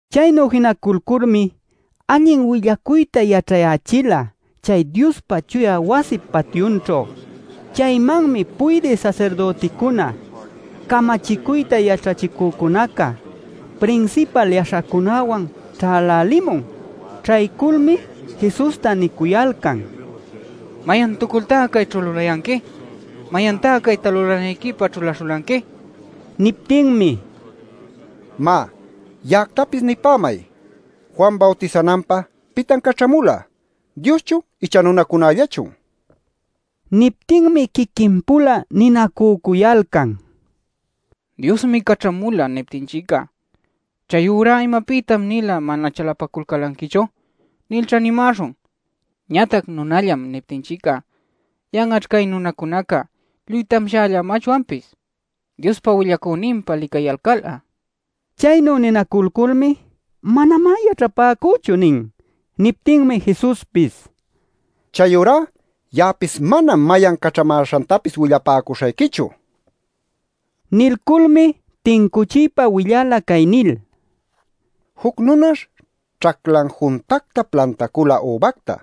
Chaynu jinaculculmi allin willacuyta yaćhayächila chay Diospa chuya wasip patyunćhu. Chaymanmi puydï sasirdüticuna, camachicuyta yaćhachicücunaca, prinsipal yaśhacunäwan ćhälälimun. Ćhayculmi Jesusta nicuyalcan: “¡¿Mayantucultá cayćhu lulayanqui?! ¡¿Mayantá cayta lulanayquipä ćhulaśhulanqui?!” nil. Niptinmi: “Má, ya'actapis nipämay. Juan bawtisananpä ¿pitan caćhamula? ¿Dioschun icha nunacunällachun?” nila. Niptinmi quiquin-pula ninacücuyalcan: “ ‘Diosmi caćhamula’ niptinchic'a, ‘Chayurá ¿imapïtan-nila mana chalapaculanquichu?’ nilćha nimäśhun. Ñatac ‘Nunallam’ niptinchic'a yan'aćh cay nunacunaca lluy tamshällamachwanpis Diospa willacüninpa licayalcal'a” nil. Chaynu ninaculculmi: “Manamá yaćhapäcüchu” nin. Niptinmi Jesuspis: “Chayurá ya'apis manam mayan caćhamäśhantapis willapäcuśhayquichu” nila. Nilculmi tincuchiypa willala cay nil: “Juc nunash ćhaclan juntacta plantacula übacta.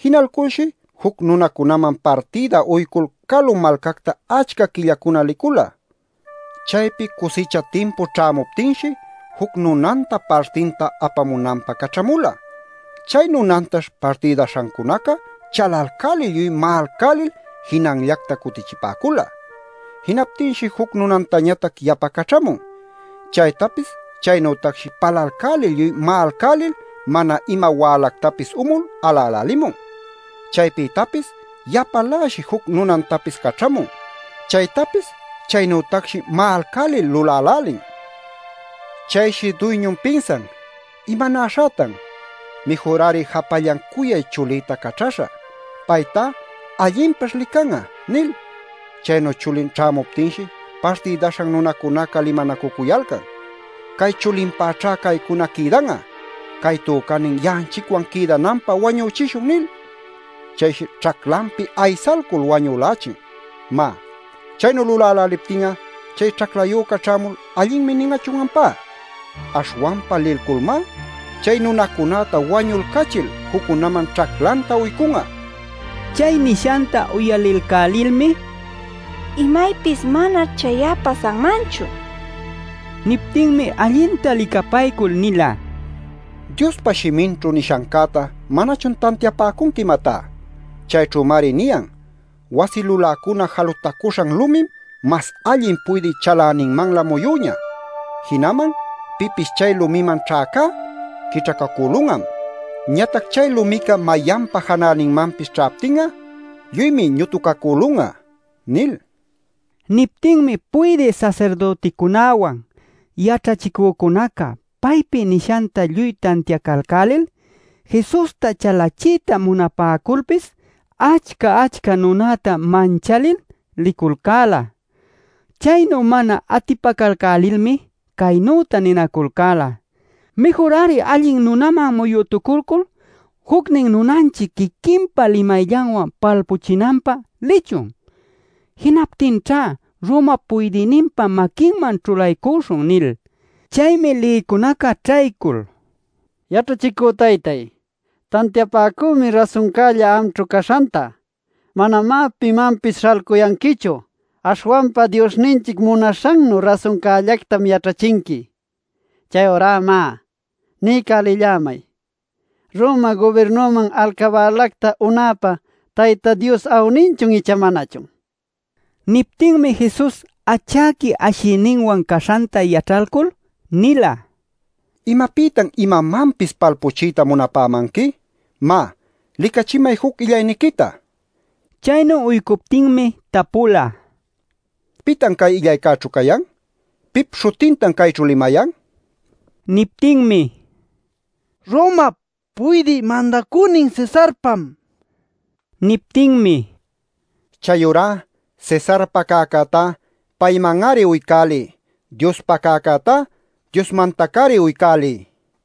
Jinalculshi juc nunacunaman partïda uycul calu malcacta achca quillacuna licula. Chaypi cusicha timpu ćhämuptinshi juc nunanta partinta apamunanpä caćhamula. Chay nunantash partïdaśhancunaca chalalcälil lluy ma'alcälil jinanllacta cutichipäcula. Jinaptinshi juc nunantañatac yapa caćhamun. Chaytapis chaynütacshi palalcälil lluy ma'alcälil mana ima wälactapis umul alälälimun. Chaypïtapis yapaläshi juc nunantapis caćhamun. Chaytapis chaynütacshi ma'alcälil lulälälin. Chayshi duyñun pinsan: ‘¿Imanäśhätan? Mïjur-ari japallan cuyay chulïta caćhäśhä. Paytá allinpaćh lican'a’ nil. “Chaynu chulin ćhämuptinshi partïdaśhan nunacunaca limanacucuyalcan: ‘Cay chulinpäćhá caycuna quïdan'a. Cay tücänin ya'anchicwan quïdananpä wañüchishun’ nil. Chayshi ćhaclanpi aysalcul wañülächin. Má ¿chaynu luläläliptin'a chay ćhaclayüca ćhämul ‘allinmi’ nin'achun ampá? Aśhwanpa lilculmá chay nunacunäta wañulcachil juccunaman ćhaclanta uycun'a” nila. Chay nishanta uyalilcälilmi: “¡Imaypis manaćh chay'a pasanmanchu!” nipäcula. Niptinmi allinta licapaycul nila: “¿Diospa shiminćhu nishancäta manachun tantiapäcunqui, imatá? Chayćhümari niyan: ‘Wasi luläcuna jalutacuśhan lumim mas allin puydï chaläninmanlä muyüñä. Jinaman pipis chay lumiman ćhäcá, quićhacacülun'am. Ñatac chay lumica mayanpa janäninmanpis ćhaptin'a lluymi ñutucacülun'a’ nil” nin. Niptinmi puydï sasirdüticunäwan yaćhachicücunaca paypi nishanta lluy tantiacalcälil Jesusta chalachiyta munapäculpis achca-achca nunäta manchalil liculcäla. Chaynu mana atipacalcälilmi caynüta ninaculcäla: “Mïjur-ari allin nunaman muyütuculcul jucnin nunanchic quiquinpa limayllanwan palpuchinanpä lichun. Jinaptinćha Roma puydïninpa maquinman ćhulaycuśhun” nil. Chaymi lïcunaca ćhaycul: “Yaćhachicü taytáy, tantiapäcümi rasuncälla amćhu caśhanta. Manamá pimanpis śhalcuyanquichu. Aśhwanpa Diosninchic munaśhannu rasuncällactam yaćhachinqui. Chayurá má, niycälillämay ¿Roma gubirnuman alcabälacta unapä Tayta Dios awninchun icha manachun?” nil. Niptinmi Jesus achäqui ashiyninwan caśhanta yaćhalcul nila: “¿Imapïtan imamanpis palpuchiyta munapämanqui? Má, licachimay juc illayniquita” nil. Chaynu uycuptinmi tapula: “¿Pitan cay illaycäćhu cayan? ¿Pip śhutintan cayćhu limayan?” nil. Niptinmi: “Romap Puydï Mandacünin Cesarpam” nila. Niptinmi: “Chayurá Cesarpa cäcätá payman-ari uycäliy. Diospa cäcätá Diosmantac-ari uycäliy” nila.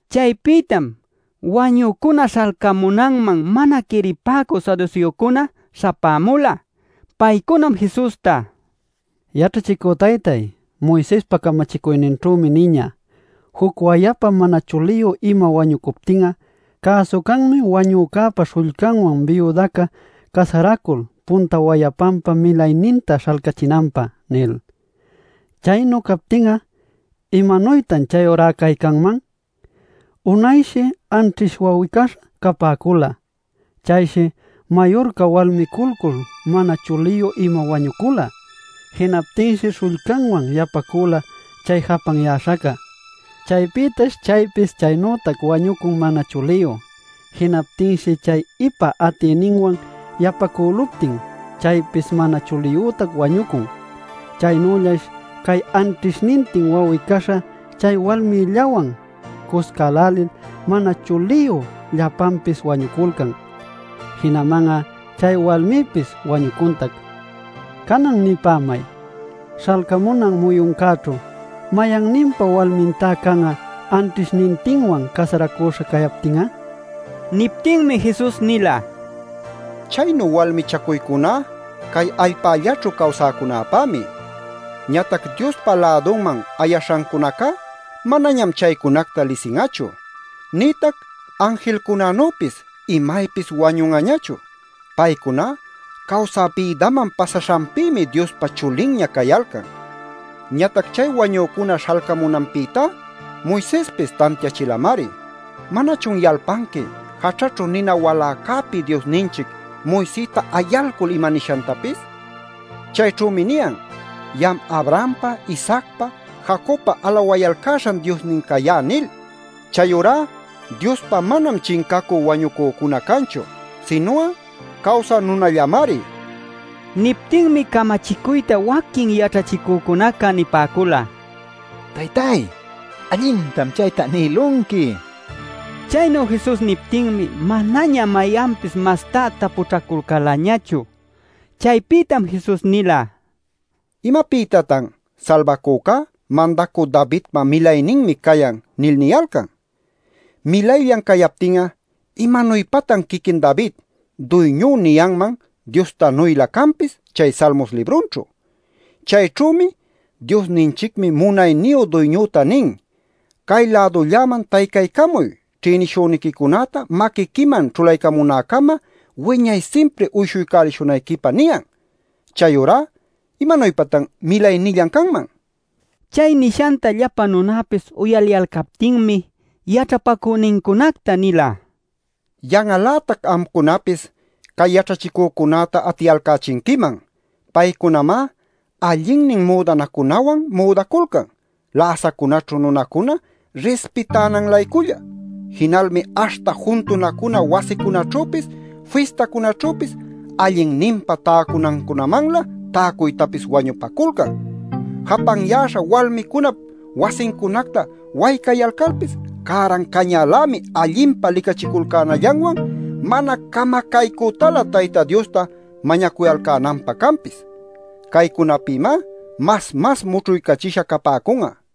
Chaypïtam wañücuna śhalcamunanman mana quiripäcü saduseocunaca śhapämula. Paycunam Jesusta: “Yaćhachicü taytay, Moisespa camachicuyninćhümi niñä: ‘Juc wayapa mana chuliyu ima wañucuptin'a cäsu canmi wanücäpa śhullcanwan biudaca casaracul punta wayapanpa milayninta śhalcachinanpä’ nil. Chaynu captin'a, ¿imanuytan chayurá cay canman? Unayshi anćhish wawi-caśha capäcula. Chayshi mayurca walmiculcul mana chuliyu ima wañucula. Jinaptinshi śhullcanwan yapacüla chay japanyäśhaca. Chaypïtash chaypis chaynütac wañucun mana chuliyu. Jinaptinshi chay ipa atïninwan yapacüluptin chaypis mana chuliyütac wañucun. Chaynüllash cay anćhishnintin wawi-caśha chay walmillawan cuscälälil mana chuliyu llapanpis wañuculcan. Jinaman'a chay walmipis wañucuntac. Canan nipämay: Śhalcamunan muyuncäćhu ¿mayanninpa walmintá can'a anćhishnintinwan casaracuśha cayaptin'a?” nin. Niptinmi Jesus nila: “Chaynu walmichacuycuná cay allpällaćhu cawsäcunapämi. Ñatac Diospa lädunman ayaśhancunacá manañam chaycunacta lisin'achu. Nïtac anjilcunanüpis imaypis wañun'añachu. Paycuná cawsä bïdaman pasaśhanpïmi Diospa chulinña cayalcan. “Ñatac chay wañücuna śhalcamunanpïtá Moisespis tantiachilamari. ¿Manachun yalpanqui jaćhäćhu nina waläcäpi Diosninchic Moisesta ayalcul imanishantapis? Chayćhümi niyan: ‘Ya'am Abrahampa, Isaacpa, Jacobpa alawayalcäśhan Diosnin cayá’ nil. Chayurá Diospá manam chincacü wañucücuna canchu; sinu'a cawsä nunallamari” nila. Niptinmi camachicuyta waquin yaćhachicücunaca nipäcula: “Taytáy, allintam chaytá nïlunqui” nil. Chaynu Jesus niptinmi manaña mayanpis mastá tapućhaculcälañachu. Chaypïtam Jesus nila: “¿Imapïtatan ‘Salbacücá Mandacü Davidpa milayninmi cayan’ nil niyalcan? Milayllan cayaptin'a, ¿imanuypatan quiquin David ‘Duyñú’ niyanman Diostanuylä canpis chay Salmos librunćhu? Chayćhümi ‘Diosninchicmi munayniyu Duyñüta nin: “Cay-lädulläman taycaycamuy ćhïnishüniquicunäta maquiquiman ćhulaycamunäcama wiñay simpri uyshuycälishunayquipä” niyan.’ “Chayurá ¿imanuypatan milaynillan canman?” nin. Chay nishanta llapa nunapis uyaliyalcaptinmi yaćhapacünincunacta nila: “Yan'al-lätac amcunapis cay yaćhachicücunäta atiyalcächinquiman. Paycunamá allinnin müdanacunawan müdaculcan läsacunäćhu nunacuna rispitänan-layculla. Jinalmi aśhta juntunacuna wasicunaćhüpis fistacunaćhüpis allinninpa täcunancunamanlä täcuytapis wañupaculcan. Japanyäśha walmicunap wasincunacta waycayalcalpis cäran cañälämi allinpa licachiculcänallanwan mana camacaycütalä Tayta Diosta mañacuyalcänanpä canpis. Caycunapïmá mas mas mućhuycachisha capäcun'a” nila.